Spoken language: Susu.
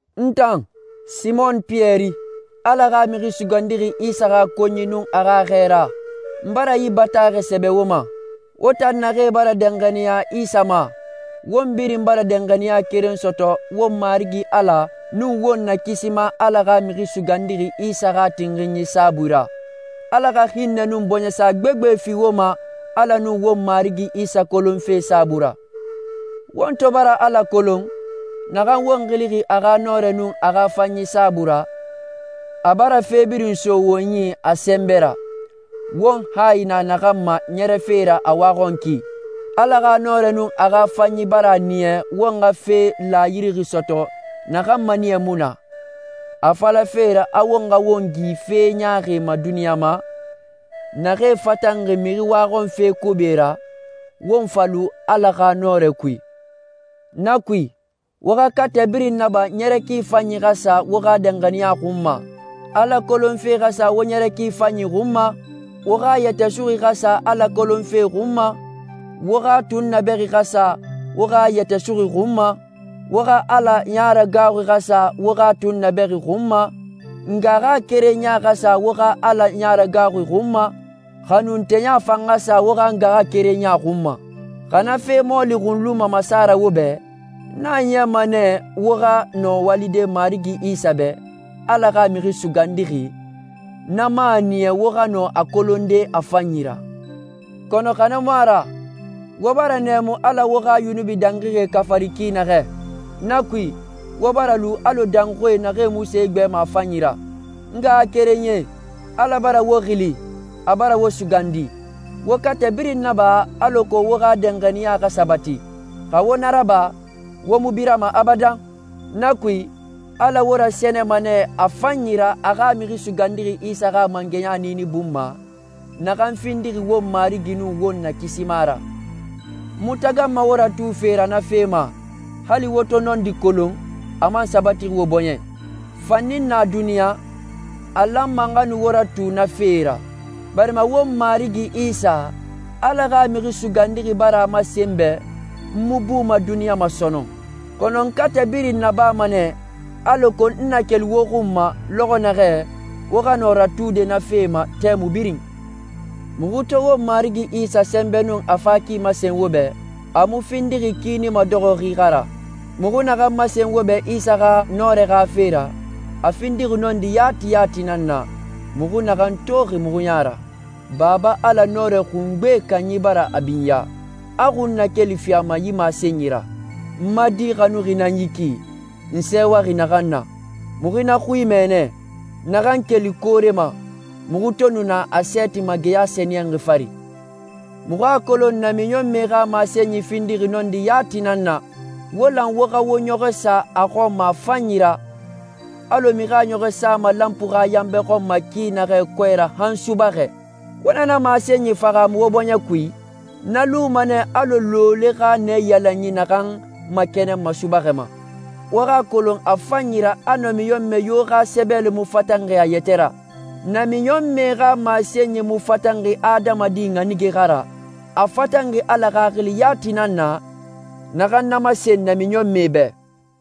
N tan, Simon Piyɛri, Ala xa Mixi Sugandixi Isa xa konyi nun a xa xɛɛra, n bara yi bataaxɛ sɛbɛ wo ma. Won tan naxee bara danxaniya Isa ma, won birin bara danxaniya keren sɔtɔ won Marigi Ala nun won Nakisima Ala xa Mixi Sugandixi Isa xa tinxinyi saabui ra. Ala xa hinnɛ nun bɔɲɛsa gbegbe fi wo ma Ala nun won Marigi Isa kolonfe saabui ra. Won to bara Ala kolon, naxan won xilixi a xa nɔrɛ nun a xa fanyi saabui ra, a bara fe birin so won yi a sɛnbɛ ra, won hayi na naxan ma ɲɛrɛfe ra a waxɔnki. Ala xa nɔrɛ nun a xa fanyi bara a niya won xa fe laayidixi sɔtɔ naxan maniyɛ mu na, a falafe ra a won xa won gi fe ɲaaxie ma duniɲa ma, naxee fatanxi mixi waxɔnfe kobi ra, won fa lu Ala xa nɔrɛ kui. Na kui, wo xa katɛ birin naba ɲɛrɛ ki fanyi xa sa wo xa danxaniya xun ma, Ala kolonfe xa sa wo ɲɛrɛ ki fanyi xun ma, wo xa yɛtɛ suxui xa sa Ala kolonfe xun ma, wo xa tunnabɛxi xa sa wo xa yɛtɛ suxui xun ma, wo xa Ala yaragaaxui xa sa wo xa tunnabɛxi xun ma, ngaxakerenya xa sa wo xa Ala yaragaaxui xun ma, xanunteya fan xa sa wo xa ngaxakerenya xun ma. Xa na fe mɔɔli xun luma masa ra wo bɛ, na a niyama nɛ wo xa nɔ walide Marigi Isa bɛ, Ala xa Mixi Sugandixi, na man a niya wo xa nɔ a kolonde a fanyi ra. Kɔnɔ xa na mu a ra, wo bara nɛɛmu Ala wo xa yunubi dangixie xafarixi ki naxɛ. Na kui, wo bara lu alɔ dɔnxui naxan mu se igbɛma a fanyi ra. N ngaxakerenyie, Ala bara wo xili, a bara wo sugandi. Wo katɛ birin naba alako wo xa danxaniya xa sabati. Xa wo na raba, wo mu birama abadan. Na kui, Ala wo rasɛnɛma nɛ a fanyi ra a xa Mixi Sugandixi Isa xa mangɛya niini bun ma, naxan findixi won Marigi nun won Nakisima ra. N mu taganma wo ratufe ra na fe ma, hali wo to nɔndi kolon, a man sabatixi wo bɔɲɛ i. Fanni n na duniɲa, a lanma n xa nu wo ratu na fee ra, barima won Marigi Isa, Ala xa Mixi Sugandixi bara a masen n bɛ n mu buma duniɲa ma sɔnɔn. Kɔnɔ n katɛ birin nabama nɛ, alako n na keli wo xun ma lɔxɔ naxɛ, wo xa nɔ ratude na fee ma tɛmui birin. Muxu to won Marigi Isa sɛnbɛ nun a fa ki masen wo bɛ, a mu findixi kiini madɔxɔxi xa ra. Muxu naxan masen wo bɛ Isa xa nɔrɛ xa fe ra, a findixi nɔndi yati yati nan na, muxu naxan toxi muxu ya ra. Baba Ala Nɔrɛ Xungbe Kanyi bara a binya, a xunnakeli fi a ma yi masenyi ra, «N ma Di xanuxi nan yi ki, n sɛɛwaxi naxan na.» Muxu na xui mɛ nɛ, naxan keli koore ma, muxu to nu na a sɛɛti ma geya sɛniyɛnxi fari. Muxu a kolon namiɲɔnmɛe xa masenyie findixi nɔndi yati nan na. Wo lan wo xa wo ɲɔxɔ sa na xɔn ma a fanyi ra, alɔ mixi a ɲɔxɔ sama lanpui xa yanbɛ xɔn ma ki naxɛ kɔɛ ra han subaxɛ. Wo na na masenyi fahaamu wo bɔɲɛ kui, na luma nɛ alɔ looloe xa naiyalanyi naxan makɛnɛnma subaxɛ ma. Wo xa a kolon a fanyi ra a namiɲɔnmɛ yo xa sɛbɛli mu fatanxi a yɛtɛ ra. Namiɲɔnmɛ xa masenyi mu fatanxi adamadi ɲanige xa ra, a fatanxi Ala Xaxili yati nan na, naxan na masen namiɲɔnmɛe bɛ.